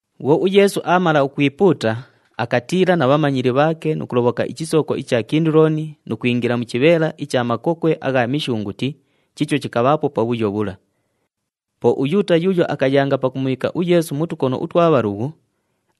Bhwo uYeesu aamala ukwipuuta, akatiila na bhamanyili bhaake nu kulobhoka ichisooko icha Kinduloni nu kwingila mu chibheela icha makokwe agha mishunguti chiicho chikabhaapo pabhuyo bhula. Po uYuuta yuuyo akayanga pakumubhiika uYeesu mu tukono utwa bhalughu,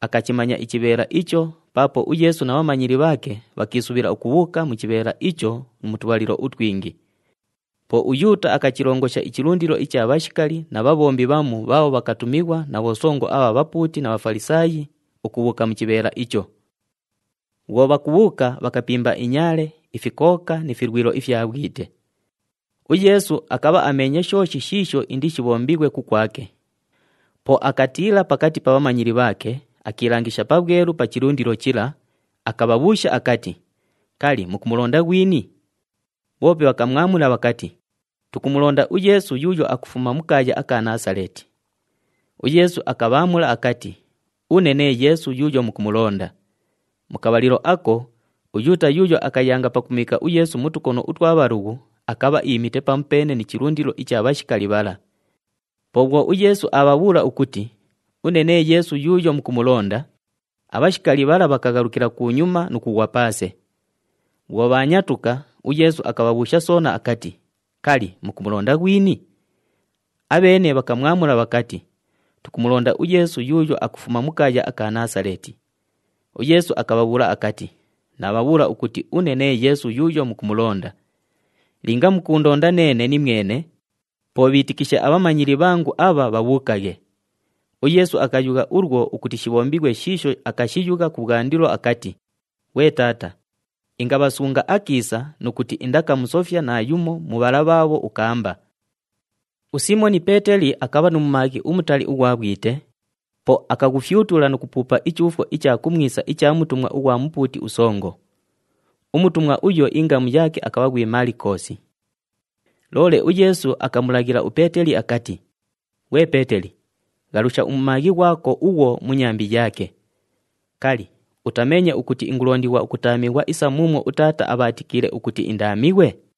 akachimanya ichibheela icho paapo uYeesu na bhamanyili bhaake bhakiisubhila ukubhuuka mu chibheela icho mu tubhalilo utwingi. Po uYuuta akachilongosha ichilundilo icha bhashikali na bhabhombi bhamu bhaabho bhakatumighwa na bhosongo abha bhapuuti na Bhafalisaayi ukubhuuka mu chibheela icho. Bhwo bhakubhuuka, bhakapimba inyaale, ifikooka ni filwilo ifya bhwite. UYeesu akabha ameenye shooshi shiisho indishibhombighwe kukwake. Po akatiila pakati pa bhamanyili bhaake, akiilangisha pabhwelu pa chilundilo chila, akabhabhuusha akati, “Kali, mukumulonda ghwini?” Bhoope bhakamwamula bhakati, “Tukumulonda uYeesu yuuyo akufuma mu kaaya aka Naasaleeti.” UYeesu akabhaamula akati, “Une nee Yeesu yuuyo mukumulonda.” Mu kabhalilo ako, uYuuta yuuyo akayanga pakumubhiika uYeesu mu tukono utwa bhalughu akabha iimite pamupeene ni chilundilo icha bhashikali bhala. Po bhwo uYeesu aabhabhuula ukuti, “Une nee Yeesu yuuyo mukumulonda,” abhashikali bhala bhakaghalukila kunyuma nu kughwa paase. Bhwo bhaanyatuka, uYeesu akabhabhuusha soona akati, “Kali, mukumulonda ghwini?” Abheene bhakamwamula bhakati, “Tukumulonda uYeesu yuuyo akufuma mu kaaya aka Naasaleeti.” UYeesu akabhabhuula akati, “Naabhabhuula ukuti une nee Yeesu yuuyo mukumulonda. Linga mukuundonda neene nimwene, po bhiitikishe abhamanyili bhangu abha bhabhuukaghe.” UYeesu akayugha ulwo ukuti shibhombighwe shiisho akashiyugha kubhwandilo akati, “Ghwe Taata, ingabhasunga akiisa nu kuti indakamusofya naayumo mu bhala bhaabho ukaamba.” USiimoni Peeteli akabha nu mumaaghi umutali ughwa bhwite, po akaghufyutula nu kupuupa ichuufwo icha kumwisa icha mutumwa ughwa mupuuti usongo. Umutumwa uyo ingamu yaake akabha ghwi Malikoosi. Loole uYeesu akamulaghila uPeeteli akati, “Ghwe Peeteli, ghalusha umumaaghi ghwako ughwo mu nyambi yaake. Kali, utameenye ukuti ingulondighwa ukutaamighwa isa muumwo uTaata abhaatikiile ukuti indaamighwe?”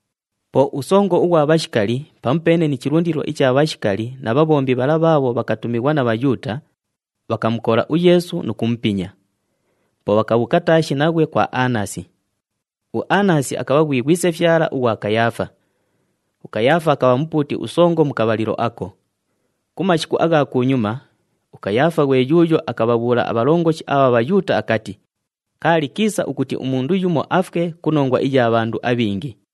Po usongo ughwa bhashikali pamupeene ni chilundilo icha bhashikali na bhabhombi bhala bhaabho bhakatumighwa na Bhayuuta, bhakamukola uYeesu nu kumupinya. Po bhakabhuuka taashi naghwe kwa Anasi. UAnasi akabha ghwi ghwisefyala ughwa Kayaafa. UKayaafa akabha mupuuti usongo mu kabhalilo ako. Ku mashiku agha kunyuma, uKayaafa ghwe yuuyo akabhabhuula abhalongoshi abha Bhayuuta akati, “Kaali kiisa ukuti umundu yumo afwe ku nongwa iya bhandu abhingi.”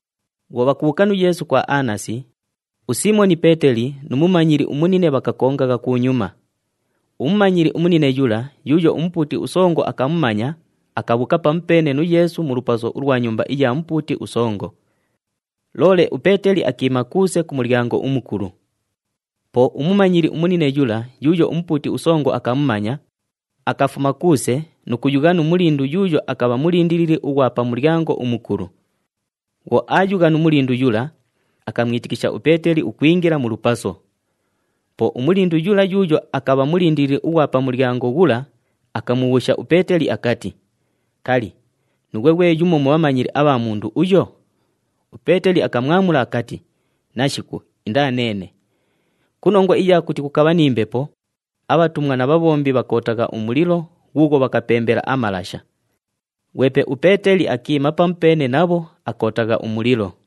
Bhwo bhakubhuuka nu Yeesu kwa Anasi, uSiimoni Peeteli nu mumanyili umunine bhakakongagha kunyuma. Umumanyili umunine yula yuuyo umupuuti usongo akamumanya akabhuuka pamupeene nu Yeesu mu lupaso ulwa nyumba iya mupuuti usongo. Loole uPeeteli akiima kuuse ku mulyango umukulu. Po umumanyili umunine yula yuuyo umupuuti usongo akamumanya, akafuma kuuse nu kuyugha nu mulindu yuuyo akabha mulindilili ughwa pa mulyango umukulu. Bhwo aayugha nu mulindu yula, akamwitikisha uPeeteli ukwingila mu lupaso. Po umulindu yula yuuyo akabha mulindilili ughwa pa mulyango ghula akamubhuusha uPeeteli akati, “Kali, nuughwe ghwe yumo mu bhamanyili abha mundu uyo?” UPeeteli akamwamula akati, “Nashiku, indaa neene.” Ku nongwa iya kuti kukabha ni mbepo, abhatumwa na bhabhombi bhakootagha umulilo ghuughwo bhakapembela amalasha. Ghwepe uPeeteli akiima pamupeene nabho, akootagha umulilo.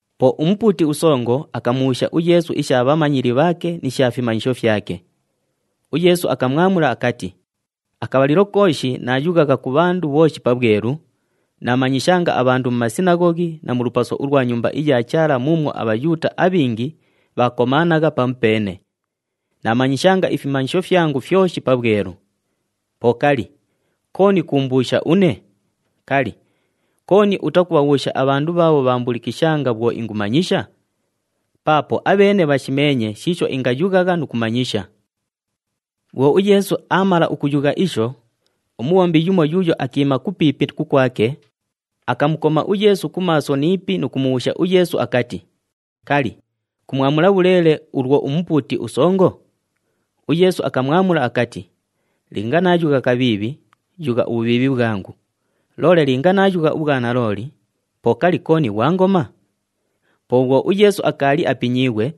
Po umupuuti usongo akamubhuusha uYeesu isha bhamanyili bhaake ni sha fimanyisho fyake. UYeesu akamwamula akati, “Akabhalilo kooshi naayughagha ku bhandu bhooshi pabhwelu, naamanyishanga abhandu mu sinaghoghi na mu lupaso ulwa Nyumba iya Chaala muumwo aBhayuuta abhingi bhaakomaanagha pamupeene. Naamanyishanga ifimanyisho fyangu fyoshi pabhwelu. Po kali, kooni kuumbuusha une? Kali, kooni utakubhabhuusha abhandu bhaabho bhakaambulikishanga bhwo ingumanyisha? Paapo abheene bhashimeenye shiisho ingayughagha nu kumanyisha.” Bhwo uYeesu aamala ukuyugha isho, umubhombi yumo yuuyo akiima kupiipi kukwake, akamukoma uYeesu ku maaso ni ipi nu kumubhuusha uYeesu akati, “Kali, kumwamula bhuleele ulwo umupuuti usongo?” UYeesu akamwamula akati, “Linga naayugha kabhiibhi, yugha ubhubhiibhi bhwangu. Loole linga naayugha ubhwanalooli, po kali, kooni ghwangoma?” Po bhwo uYeesu akaali apinyiighwe,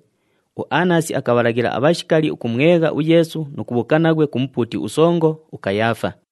uAnasi akabhalaghila abhashikali ukumwegha uYeesu nu kubhuuka naghwe ku mupuuti usongo, uKayaafa.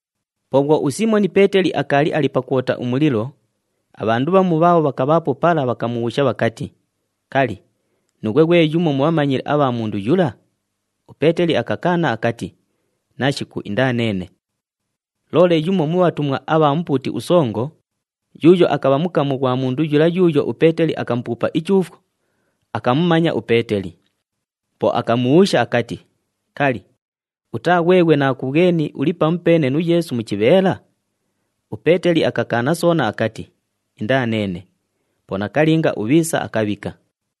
Po bhwo uSiimoni Peeteli akaali ali pakwota umulilo, abhandu bhamu bhaabho bhakabhaapo pala bhakamubhuusha bhakati, “Kali, nuughwe ghwe yumo mu bhamanyili abha mundu yula?” UPeeteli akakaana akati, “Nashiku, indaa neene.” Loole yumo mu bhatumwa abha mupuuti usongo, yuuyo akabha mukamu ghwa mundu yula yuuyo uPeeteli akamupuupa ichuufwo, akamumanya uPeeteli. Po akamubhuusha akati, “Kali, utaa ghweghwe naakubhweni uli pamupeene nu Yeesu mu chibheela?” UPeeteli akakaana soona akati, “Indaa neene.” Po nakalinga ubhiisa akabhika.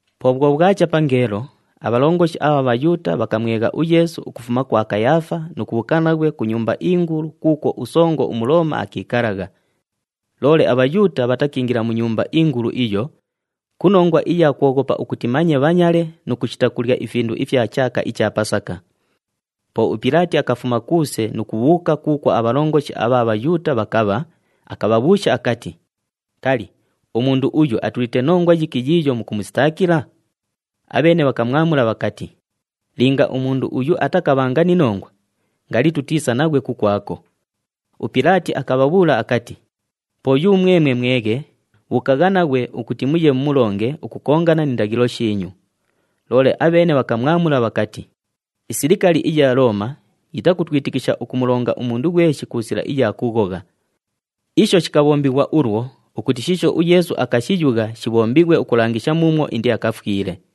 Po bhwo bhwacha pangeelo, abhalongoshi abha Bhayuuta bhakamwegha uYeesu ukufuma kwa Kayaafa nu kubhuuka naghwe ku nyumba ingulu, kuukwo usongo uMulooma akiikalagha. Loole aBhayuuta bhatakiingila mu nyumba ingulu iyo, ku nongwa iya kwoghopa ukuti manye bhanyale nu kushita kulya ifindu ifya chaaka icha Pasaka. Po uPilaati akafuma kuuse nu kubhuuka kuukwo abhalongoshi abha Bhayuuta bhakabha, akabhabhuusha akati, “Kali, umundu uyu atulite nongwa yiki yiiyo mukumusitaakila?” Abheene bhakamwamula bhakati, “Linga umundu uyu atakabhanga ni nongwa, ngali tutiisa naghwe kukwako.” UPilaati akabhabhuula akati, “Po yumwemwe mweghe, bhuukagha naghwe ukuti muye mumulonge ukukongana ni ndaghilo shiinyu.” Loole abheene bhakamwamula bhakati, “Isilikali iya Looma yitakutwikitisha ukumulonga umundu ghweshi ku sila iya kughogha.” Isho shikabhombighwa ulwo ukuti shiisho uYeesu akashiyugha shibhombighwe ukulangisha muumwo indiakafwile.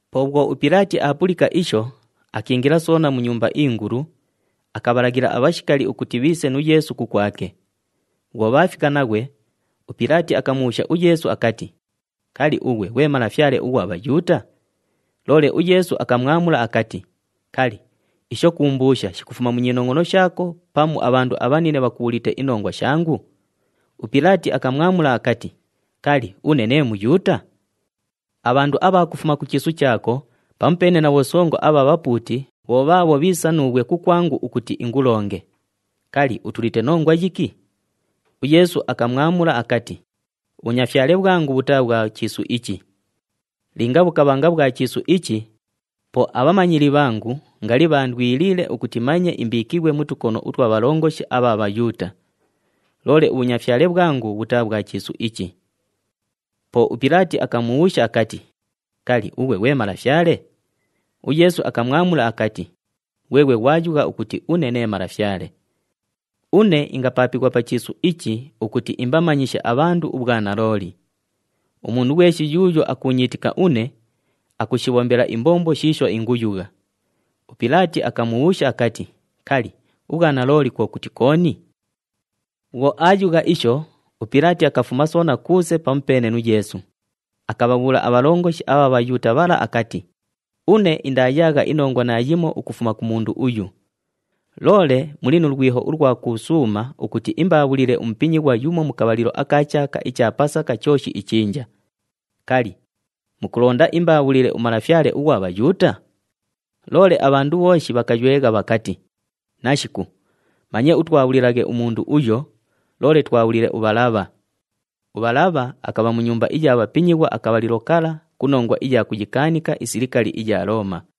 Po bhwo uPilaati aapulika isho, akiingila soona mu nyumba ingulu, akabhalaghila abhashikali ukuti bhiise nu Yeesu kukwake. Bhwo bhaafika naghwe, uPilaati akamubhuusha uYeesu akati, “Kali, ughwe ghwe Malafyale ughwa Bhayuuta?” Loole uYeesu akamwamula akati, “Kali, isho kuumbuusha shikufuma mu nyinongʼono shaako pamu abhandu abhanine bhakubhuulite inongwa shangu?” UPilaati akamwamula akati, “Kali, une nee Muyuuta? Abhandu abha kufuma ku chiisu chaako pamupeene na bhosongo abha bhapuuti bho bhaabho bhiisa nuughwe kukwangu ukuti ingulonge. Kali, utulite nongwa yiki?” UYeesu akamwamula akati, “Ubhunyafyale bhwangu bhutaa bhwa chiisu ichi. Linga bhukabhanga bhwa chiisu ichi, po abhamanyili bhangu ngali bhaandwiliile ukuti manye imbiikighwe mu tukono utwa bhalongoshi abha Bhayuuta. Loole ubhunyafyale bhwangu bhutaa bhwa chiisu ichi.” Po uPilaati akamubhuusha akati, “Kali, ughwe ghwe malafyale?” UYeesu akamwamula akati, “Ghweghwe ghwayugha ukuti une nee malafyale. Une ingapaapighwa pa chiisu ichi ukuti imbamanyishe abhandu ubhwanalooli. Umundu ghweshi yuuyo akuunyiitika une, akushibhombela imbombo shiisho inguyugha.” UPilaati akamubhuusha akati, “Kali, ubhwanalooli kwo kuti kooni?” Bhwo aayugha isho, uPilaati akafuma soona kuuse pamupeene nu Yeesu, akabhabhuula abhalongoshi abha Bhayuuta bhala akati, “Une indaayaagha inongwa naayimo ukufuma ku mundu uyu. Loole muli nu lwiho ulwa kuusuuma ukuti imbaabhulile umupinyighwa yumo mu kabhalilo aka chaaka icha Pasaka chooshi ichinja. Kali, mukulonda imbaabhulile uMalafyale ughwa Bhayuuta?” Loole abhandu bhooshi bhakaywegha bhakati, “Nashiku! Manye utwabhulilaghe umundu uyo, loole twabhulile uBhalabha.” UBhalabha akabha mu nyumba iya bhapinyighwa akabhalilo kala ku nongwa iya kuyikaanika isilikali iya Looma.